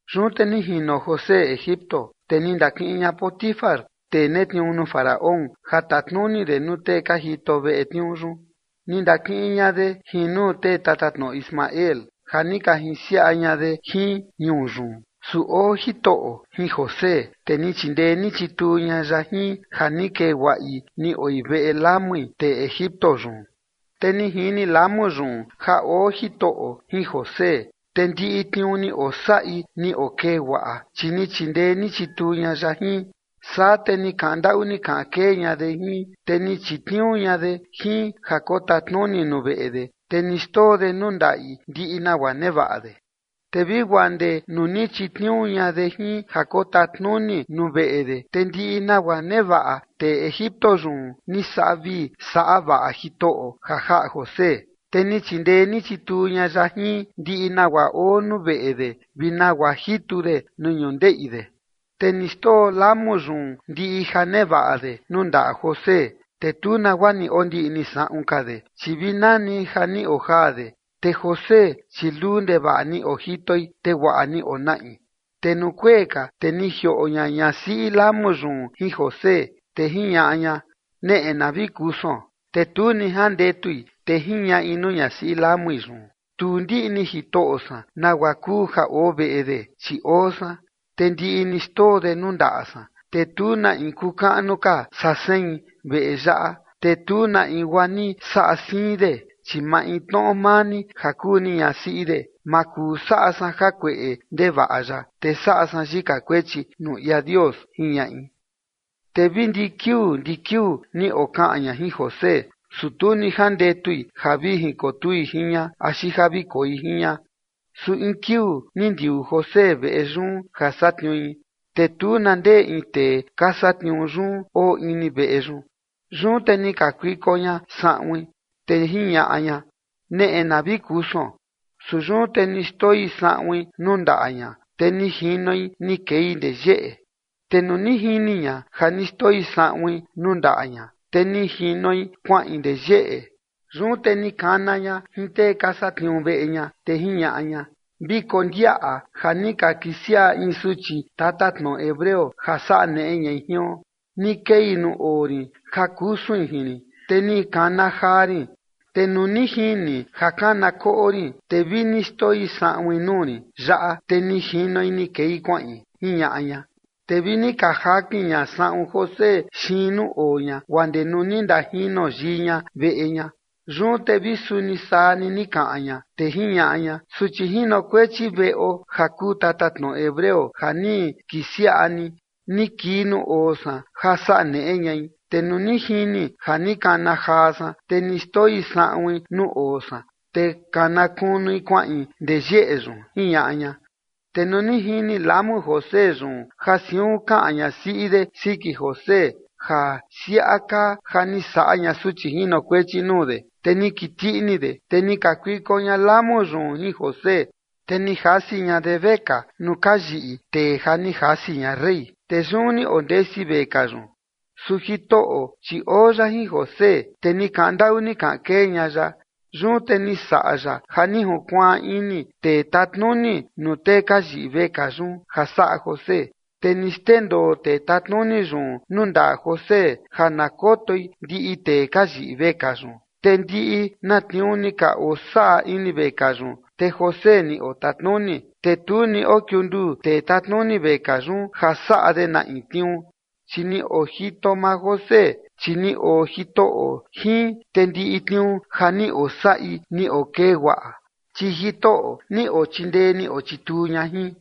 Yun te ni jino José Egipto, te ni ndakiꞌin ña Potifar, tee netniuu nuu Faraón ja tatnuni de nuu tee ka jito veꞌe tniuu yun, ni ndakiꞌin ña de jin nuu tee tatatnoꞌo Ismael ja ni ka jinsiaꞌa ña de jin ñuu yun. Su oo Jitoꞌo jin José, te ni chindee ni chituu ña ya jin ja ni kee guaꞌi ni oi veꞌe lamui tee Egipto yun. Te ni jini lamu yun ja oo Jitoꞌo jin José, te ndiꞌi tniuu ni osaꞌi ni okee guaꞌa, chi ni chindee ni chituu ña ya jin. Saa te ni kaꞌan ndaꞌu ni kaꞌan kee ña de jin, te ni chitniuu ña de jin ja kotatnuni nuu veꞌe de, te ni xndoo de nuu ndaꞌi ndiꞌi nagua nevaꞌa de. Te vi guaa ndee nuu ni chitniuu ña de jin ja kotatnuni nuu veꞌe de, te ndiꞌi nagua nevaꞌa tee Egipto yun ni saꞌa vii saꞌa vaꞌa Jitoꞌo ja jaꞌa José, te ni chindee ni chituu ña ya jin ndiꞌi nagua oo nuu veꞌe de vi nagua jitu de nuu ñundeꞌi de. Te ni xndoo lamu yun ndiꞌi ja nevaꞌa de nuu ndaꞌa José, te tu nagua ni ondiꞌni saꞌun ka de, chi vi nani ja ni ojaa de. Te José, chi luu ndevaꞌa ni ojitoi, te guaꞌa ni onaꞌi. Te nuu kuee ka, te ni jioꞌo ña ñasiꞌi lamu yun jin José, te jiñaꞌa ña: ―Neꞌe na vi kusuon. Te tu ni jandetui, te jiñaꞌi nuu ñasiꞌi lamui yun: ―Tu ndiꞌni jitoꞌo san nagua kuu ja oo veꞌe de, chi oo san, te ndiꞌi ni xndoo de nuu ndaꞌa san. Te tu na in kuu kaꞌnu ka saa sein veꞌe yaꞌa, te tu na in guaa ni saꞌa siin de, chi maintnoꞌo maa ni ja kuu ni ñasiꞌi de, ma kuu saꞌa san jakueꞌe ndevaꞌa yaꞌa, te saꞌa san yika kuechi nuu ia Dios ―jiñaꞌi. Te vi ndi kiuu ndi kiuu ni okaꞌan ña jin José, su tu ni jandetui ja vi jinkotui jin ña, axi ja vi koi jin ña. Su in kiuu ni ndiuu José veꞌe yun ja satniui, te tu na ndee in tee ka satniuu yun oo ini veꞌe yun. Yun te ni kakuiko ña saꞌuin, te jiñaꞌa ña: ―Neꞌe na vi kusuon. Su yun te ni xndoi saꞌuin nuu ndaꞌa ña, te ni jinoi ni kei ndee yeꞌe. Te nuu ni jini ña ja ni xndoi saꞌuin nuu ndaꞌa ña, te ni jinoi kuaꞌin ndee yeꞌe, yun te ni kana ña jin tee ka satniuu veꞌe ña, te jiñaꞌa ña: ―Vi kondiaꞌa ja ni ka kisiaꞌa in suchi tatatnoꞌo hebreo ja saꞌa neꞌe ñai jion. Ni kei nuu oo rin ja kusuin jin rin, te ni kana jaa rin. Te nuu ni jini ja kana koꞌo rin, te vi ni xndoi saꞌuin nuu rin yaꞌa, te ni jinoi ni kei kuaꞌin ―jiñaꞌa ña. Te vi ni jakin ña saꞌun José xiin nuu oo ña guaa ndee nuu ni ndajino yii ña veꞌe ña. Yun te vi suni saa ni ni kaꞌan ña, te jiñaꞌa ña: ―Suchi jinokuechi veꞌo ja kuu tatatnoꞌo hebreo ja ni kisiaꞌa ni, ni kii nuu oo san ja saꞌa neꞌe ñai. Te nuu ni jini ja ni kana jaa san, te ni xndoi saꞌuin nuu oo san, te kana kunui kuaꞌin ndee yeꞌe yun ―jiñaꞌa ña. Te nuu ni jini lamu José yun ja siun kaꞌan ñasiꞌi de siki José ja siaꞌa kaa ja ni saꞌa ña suchi jinokuechi nuu de, te ni kiti ini de. Te ni kakuiko ña lamu yun jin José, te ni jasi ña de vekaa nuu ka yiꞌi tee ja ni jasi ña rey, te yun ni ondesi vekaa yun. Su Jitoꞌo, chi oo ya jin José, te ni kaꞌan ndaꞌu ni kaꞌan kee ña ya. Yun te ni saꞌa ya ja ni junkuaan ini tee tatnuni nuu tee ka yiꞌi vekaa yun ja saꞌa José. Te ni xndendoo tee tatnuni yun nuu ndaꞌa José ja na kotoi ndiꞌi tee ka yiꞌi vekaa yun. Te ndiꞌi na tniuu ni ka osaꞌa ini vekaa yun te José ni otatnuni. Te tu ni okiunduu tee tatnuni vekaa yun ja saꞌa de na in tniuu, chi ni ojito maa José, chi ni oo Jitoꞌo jin, te ndiꞌi tniuu ja ni osaꞌi ni okee guaꞌa, chi Jitoꞌo ni ochindee ni ochituu ña jin.